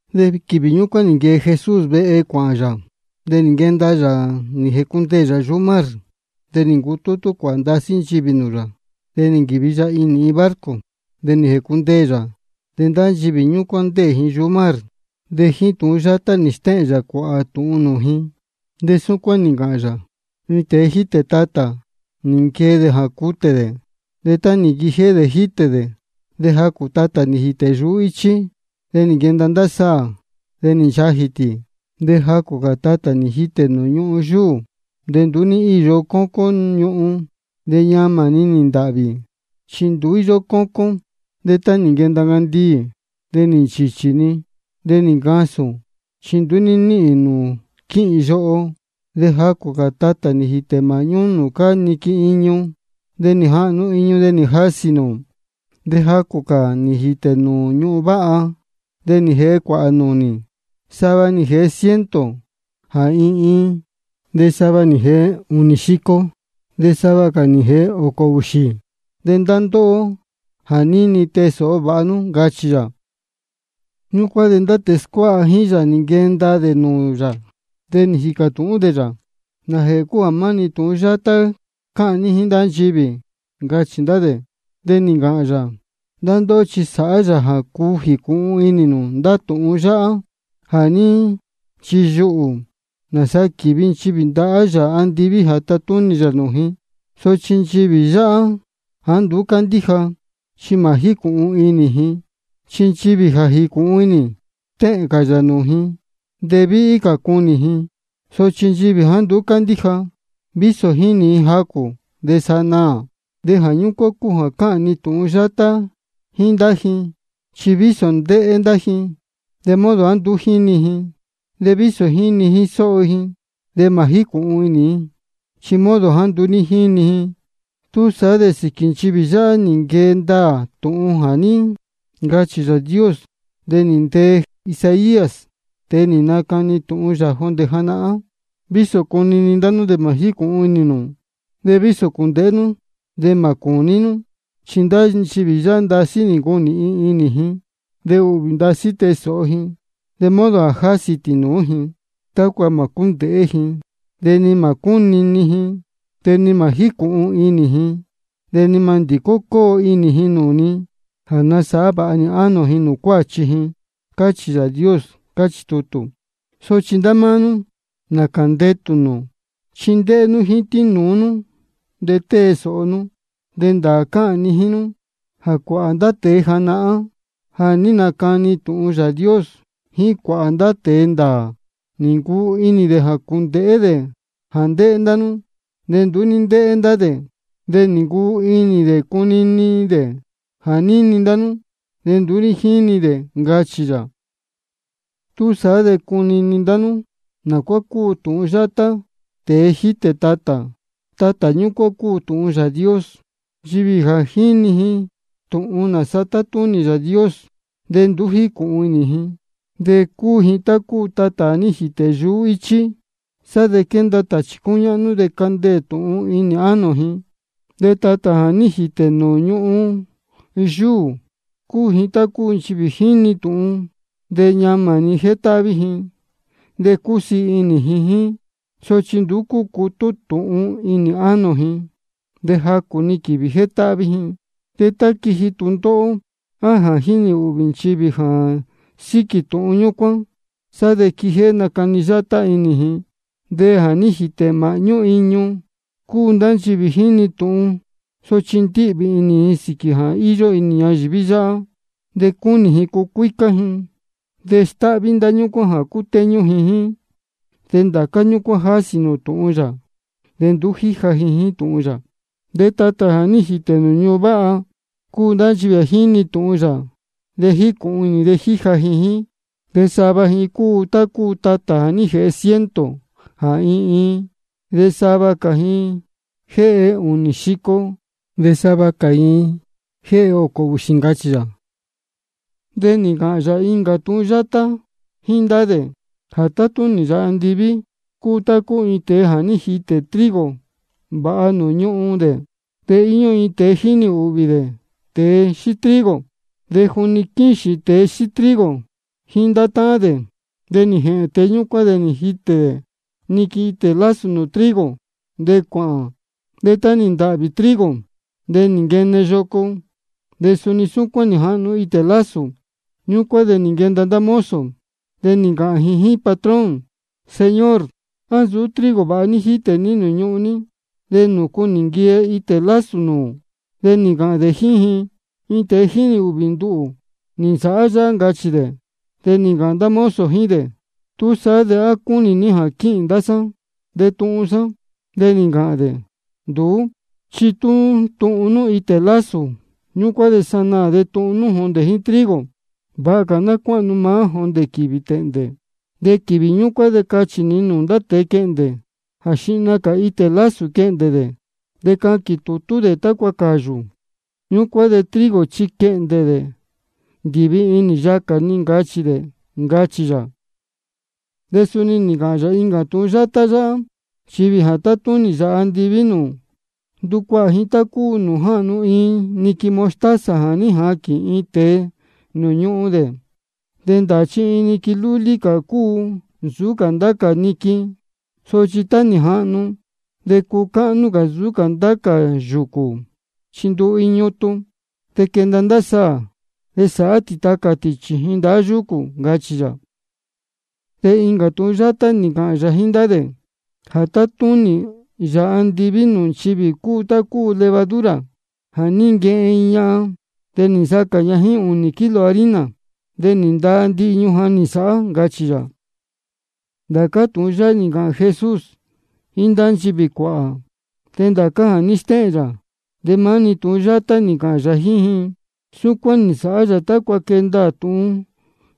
De quīvī ñúcuán nī nquee Jesús vehe cuāhān yā, de nī nquenda yā nī jēcundeē yā yuhú mar. De nī ncutútú cuāhā ndasí nchivī nūū yā. De nī nquīvi yā inī iin barco, de nī jēcundeē yā. De ndá nchivī ñúcuán ndéē ji yuhú mar. De jíín tūhun yátá nī stéhēn yā cuāhā tūhun nūū ji, de súcuán nī ncāhān yā: Iin tēe jítē tatā, nī nquee dē jā cutē dē. De tá nī nquijéhé dē jítē dē, de jacū tatā nī jītē yuhú íchí. De nī nquenda ndá saā, de nī nchajī tī. De jacū cā tatā nī jītē nūū ñuhun yúū, nūū nduú íyó cócón ñuhun. De ñamā-ni nī ntāhvī, chi nduú íyó cócón. De tá nī nquenda ncandiī, de nī nchīchī-ni, de nī ncasūn, chi nduú ní níhīn nūū quíhīn yoho. De jacū cā tatā nī jītē māhñú nūū cáá niquin iñu. De nī jahnu iñu, de nī jasī nūū. De jacū cā nī jītē nūū ñuhun váha, de nī jēhe cuāhā nūnī. Sava nī jēhe ciento jā iin iin, de sava nī jēhe ūnī xico, de sava cā nī jēhe ōcō ūxī. De ndá ndóhó jā níni, tee sōho vāha nú, ncachī yā. Ñúcuán de ndá tēe scuáha jíín yā nī nquenda dē nūū yā, de nī jīcā tūhún dē yā: ¿Nājēhē cúu jā maá-ni tūhun yátá cáhān ní jíín nchivī? ncachī ndá dē. De nī ncāhān yā: Ndá ndóhó chi sáhá yā jā cuu jīcūhun inī nū ndá tūhun yáhá jā ní nchiyuhū, nāsa quívi nchivī ndahá Yāā andiví jā tatúnī yā nūū ji. Sochi nchivī yáhá jāá nduú cándíja, chi mā jícūhun inī ji. Chi nchivī ja jícūhun inī, stéhēn cā yā nūū ji, de víhí cā cunī ji. Sochi nchivī jāá nduú cándíja, vísō ja jínī ji jacū, de sa naā. Jā ñúcuán cúu jā cáhān ni tūhun yátá jíín ndá ji. Chi vísō ndéhé ndá ji, de modo jāá nduú jínī ji. De vísō jíni jíín sóho ji, de mā jícūhun inī ji, chi modo jāá nduú ní jíni ji-ni. Túsaá de sīquī nchivī yáhá nī nquee ndaā tūhun jā ní ncachī Yāā Dios de nī ntee Isaías, tēe nī nacani tūhun yā jondē janahán: Vísō cunini ndá nú, de mā jícūhun inī nū, de vísō cūndēhé nú, de mā cūní nú. Chi ndá nchivī yáhá ndasí nī ncunīhin inī ji, de ūhvī ndasí tée sōho ji, de modo jā jásī ji tīnūú ji, tácua mā cúndēhé ji, de ni mā cúnini ji, de ni mā jícūhun inī ji, de ni mā ndīcó cóo inī ji nūū ni jā nasāhá vāha nī ánō ji nūū cuáchi ji. Cáchī Yāā Dios, cáchī tutū. Sochi ndá máá nú, nācā ndetū nū, chi ndéhé nú jíín tīnūú nú, de tée sōho nú. Chi ndāā cáhān ni jíín nú jā cuāhā ndá tēe janahán jā ní nacani tūhun Yāā Dios, jíín cuāhā ndá tēe ndāā, nī ncuu inī dē jā cūndēhé dē jā ndéhé ndá nú, de nduú ní ndéhé dē. De nī ncuu inī dē cunini dē jā níni ndá nú, de nduú ní jíni dē, ncachī yā. Túsaá de cunini ndá nú nā cuá cúu tūhun yátá tēe jítē tatā. Tatā ñúcuán cúu tūhun Yāā Dios. De nchivī jā jíni tūhun nāsa tátúnī Yāā Dios, de tú nduú jícūhun inī ji, de cúu ji tá cúu tatā jā ní jītē yuhú íchí. Sá de quénda tāchī cúñáhnú de cándeē-ni tūhun inī ánō ji. De tatā jā ní jītē nūū ñuhun yúū cúu tá cúu nchivī jíni tūhun, de ñamā-ni jétáhví ji de cúsiī inī ji jíín. Sochi nduú cúcutú tūhun inī ánō ji, de jacū-ni quīvī jétáhví ji. De tá quíji tūndóhó, á jā jínī ūhvī nchivī ji jā síquī tūhun ñúcuán, sá de quíjéhé nácani yátá inī ji. De jā ní jītē māhñú iñu cúu ndá nchivī jíni tūhun, sochi ndíhvī inī ji sīquī jā íyó inī ñayīví yáhá, de cúnī ji cucuícá ji, de stáhví ndá ñúcuán jā cútéñú ji jíín. De ndācá ñúcuán jásī nūū tūhun yā, de nduú jíja ji jíín tūhun yā. De tatā jā ní jītē nūū ñuhun váha cúu ndá nchivī jíni tūhun yā, de jícūhun inī ji, de jíja ji jíín. De sava ji cúu tá cúu tatā jā jéhe ciento jā iin iin, de sava cā ji jéhe ūnī xico, de sava cā ji jéhe ōcō ūxī, ncachī yā. De nī ncāhān yā incā tūhun yátá jíín ndá dē: Jā tátúnī Yāā andiví cúu tá cúu iin tēe jā ní jitē dē trigo vāha nūū ñūhún dē. De íyó iin tēe jínī ūhvī dē tēe xíí trigo. De juni quíxīn tēe xíí trigo jíín ndá táhán dē, de nī jēhēn tēe ñúcuán, de nī jitē niquin itē lásū nūū trigo, de cuāhān. De tá nī ntāhvī trigo, de nī nquene yoco, de suni súcuán nī jahnu itē lásū. Ñúcuán de nī nquenda ndá mozo, de nī ncāhān ji jíín patrón: Señor, ¿á nsūú trigo vāha ní jítē ní nūū ñūhún ní? ¿De nūcu nī nquene itē lásū nūū? De nī ncāhān dē jíín ji: Iin tēe jínī ūhvī nduhū nī nsāhá yáhá, ncachī dē. De nī ncāhān ndá mozo jíín dē: ¿Túsaá de á cúnī ní jā quīhīn ndá sá de tuhun sā? De nī ncāhān dē: Nduú, chi tú tuhun nú itē lásū ñúcuán de sanaā de tuhun nú jondē jíín trigo. Vāha cā ná cuáhnu maá jondē quīvī tēhndē. De quīvī ñúcuán de cachī ni nūū ndá tēe quehndē jā xihna cā itē lásū quehndē dē, de caquīn tūtú dē tácua cāyū. Ñúcuán de trigo chi quehndē dē ndīvi inī yacā ni, ncachī dē, ncachī yā. De suni nī ncāhān yā incā tūhun yátá yáhá: Nchivī jā tátúnī Yāā andiví nūū, ndúcuahā ji tá cúu nūū jáhnu iin niquin mostaza jā ní jaquīn iin tēe nūū ñuhun dē. De ndāā jā iin niquin lúlí cā cúu nsūú cā ndá cā niquin. Sochi tá nī jahnu, de cúu cáhnú cā nsūú cā ndá cā yūcū, chi ndúu iin ñutun. De quénda ndá saā, de sáhá tī tacā tī chījin ndahá yúcū, ncachī yā. De incā tūhun yátá nī ncāhān yā jíín ndá dē: Jā tátúnī Yāā andiví nūū nchivī cúu tá cúu levadura jā ní nquehen iin ñahan. De nī nsacā ña jíín ūnī kilo harina, de nī ndaa ndihi ñujan nī nsāhá, ncachī yā. Ndācá tūhun yáhá nī ncāhān Jesús jíín ndá nchivī cuāhā. De ndācá jā ní stéhēn yā, de maá-ni tūhun yátá nī ncāhān yā jíín ji. Súcuán nī nsāhá yā tácua quee ndaā tūhun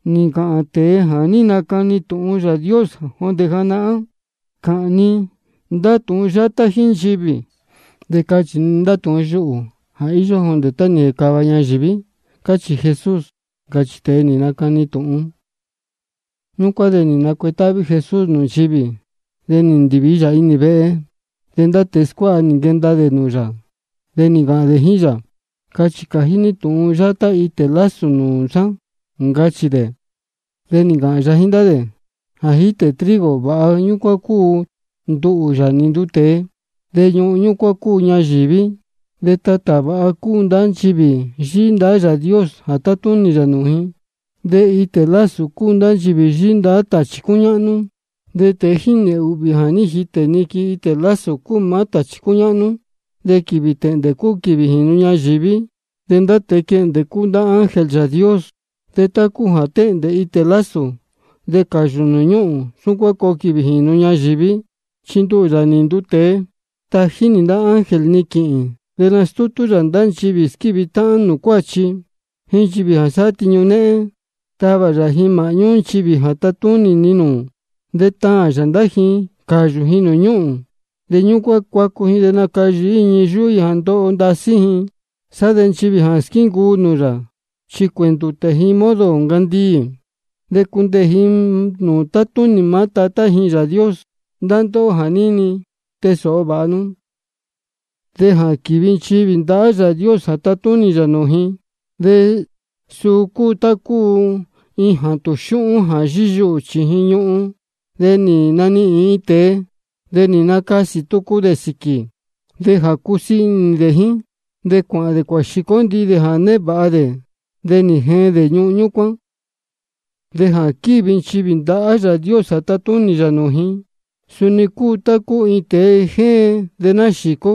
nī ncāhān tēe jā ní nacani tūhun Yāā Dios jondē janahán: Cāhān ni ndá tūhun yátá jíín nchivī, de cachī ni ndá tūhun yuhū jā íyó jondē tá nī jēcāva ñayīví. Cachī Jesús, ncachī tēe nī nacani tūhun. Ñúcuán de nī nacuetáhví Jesús nūū nchivī. De nī ndīvi yā inī vehe. De ndá tēe scuáha nī nquenda dē nūū yā, de nī ncāhān dē jíín yā: Cachī cājí ní tūhun yátá itē lásū nūū sá, ncachī dē. De nī ncāhān yā jíín ndá dē: Jā jítē trigo vāha ñúcuán cúu nduhū, Yāā nī nduu tēe. De ñuhun ñúcuán cúu ñayīví. De tatā vāha cúu ndá nchivī yíhí ndahá Yāā Dios jā tátúnī yā nūū ji. De itē lásū cúu ndá nchivī yíhí ndahá tāchī cúñáhnú. De tēe jínī ūhvī jā ní jitē niquin itē lásū cúu maá tāchī cúñáhnú. De quīvī tēhndē cúu quīvī jīnu ñayīví. De ndá tēe quehndē cúu ndá ángel Yāā Dios. De tá cúu jā tēhndē itē lásū de cāyū nūū ñúhūn, súcuán coo quīvī jīnu ñayīví. Chi nduhū, Yāā nī nduu tēe, tají nī ndá ángel ni quīhīn. De nastútú yā ndācá nchivī squívi táhán nūū cuáchi, jíín nchivī sáhá tiñu néhén, tavā yā ji māhñú nchivī jā tátúnī ni nūū. De taān yā ndá ji cāyū ji nūū ñúhūn. De ñúcuán cuacu ji de nacayīhí ji ñii yúhú ji jā ndoho ndasí ji. Sá de nchivī jā squíncuu nūū yā chi cuēndūtē ji modo ncandiī, de cundeē ji nūū tátúnī maá Tatá ji Yāā Dios. Ndá ndóhó jā níni, tee sōho vāha nú. De jā quívi nchivī ndahá Yāā Dios jā tatúnī yā nūū ji, suu cúu tá cúu iin jātūn xūhún jā yíyuhū chījin iin ñuhun. De nī nanihīn iin tēe, de nī nacasī tucu dē sīquī. De jā cúsiī inī dē jíín, de cuāhān dē cuāxīcó ndihi dē jā névāha dē, de nī jeen dē ñuhun ñúcuán. De jā quívi nchivī ndahá Yāā Dios jā tatúnī yā nūū ji, suni cúu tá cúu iin tēe jéen de náxīcó,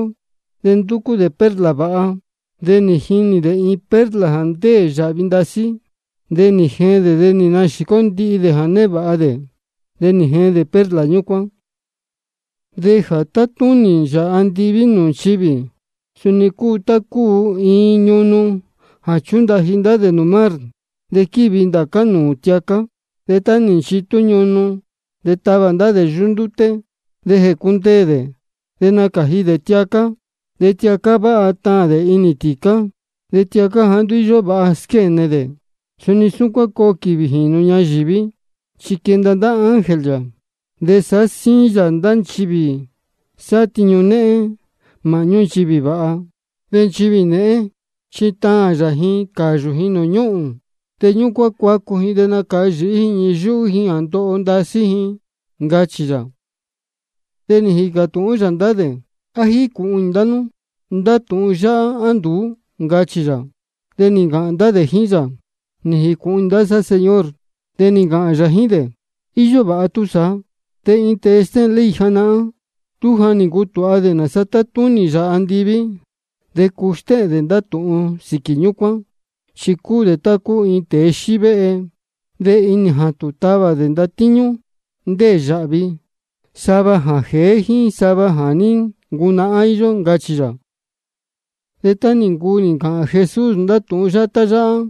de ndúcú dē perla vāha. De nī jinī dē iin perla jā ndéē yāhvi ndasí, de nī jēhēn dē nī yīcó ndihi dē jā névāha dē, de nī jeen dē perla ñúcuán. De jā tátúnī Yāā andiví nūū nchivī, suni cúu tá cúu iin ñunu jā chúndaji ndá dē nūū mar, de quívi ndācá nūū tiacá. De tá nī nchitú ñunu, de távā ndá dē yuhú ndúté. De jécundeē dē, de nácāji dē tiacá. De tiacá váha táān dē inī tīcá, de tiacá jāá nduú íyó vāha squéne dē. De suni súcuán coo quīvī jīnu ñayīví. Chi quenda ndá ángel yā, de sāhá síín yā ndá nchivī sáhá tiñu néhén māhñú nchivī vāha. De nchivī nēhén chi taān yā ji cāyū ji nūū ñúhūn. De ñúcuán cuacu ji de nacayīhí ji ñii yúhú ji jā ndoho ndasí ji, ncachī yā. De nī jīcā tūhún yā ndá dē: ¿A nī jīcūhun inī ndá nú ndá tūhun yáhá, á nduú? ncachī yā. De nī ncāhān ndá dē jíín yā: Nī jīcūhun inī sá, Señor. De nī ncāhān yā jíín dē: Iyó vāha túsaá. De iin tēe stéhēn ley janahán, tú ja nī ncutūha dē nāsa tátúnī Yāā andiví, de cuu stéhēn dē ndá tūhun sīquī ñúcuán. Chi cúu dē tá cúu iin tēe xívéhe. De inī jātūn dē távā dē ndatíñú ndéē yāhvi, sava jā jēé jíín sava jā ní ncunahán íyó, ncachī yā. De tá nī ncuu nī ncāhān Jesús ndá tūhun yátá yáhá,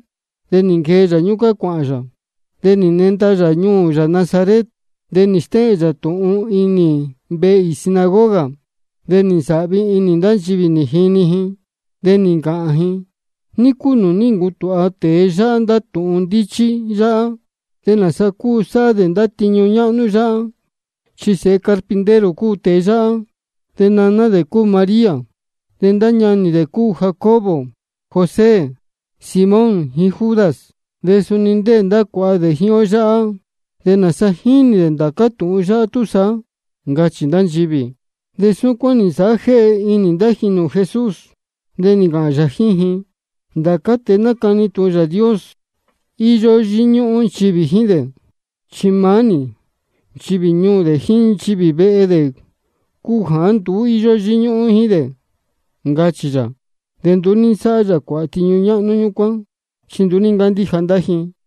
de nī nquee yā ñúcuán cuāhān yā. De nī nenda yā ñuū yā Nazaret. De nī stéhēn yā tūhun inī vehe īī sinagoga. De nī nsāhvi inī ndá nchivī nī jini ji, de nī ncāhān ji: ¿Ní cúu nūū ní ncutūha tēe yáhá ndá tūhun ndíchí yáhá? ¿De nāsa cúu sáhá dē ndá tiñu ñáhnú yáhá? Chi sēhe carpintero cúu tēe yáhá, de naná dē cúu María, de ndá ñanī dē cúu Jacobo, José, Simón, jíín Judas. De suni ndéē ndá cuāha dē jíín ó yáhá. ¿De nāsa jínī dē ndācá tūhun yáhá túsaá? ncachī ndá nchivī. De súcuán nī nsāhá jéhe inī ndá ji nūū Jesús. De nī ncāhān yā jíín ji: Ndācá tēe nácani tūhun Yāā Dios, íyó yíñúhún nchivī jíín dē, chi maá-ni nchivī ñuū dē jíín nchivī vehe dē cúu jāá nduú íyó yíñúhún jíín dē, ncachī yā. De nduú ní nsáhá yā cuāhā tiñu ñáhnú ñúcuán, chi nduú ní ncándíja ndá ji.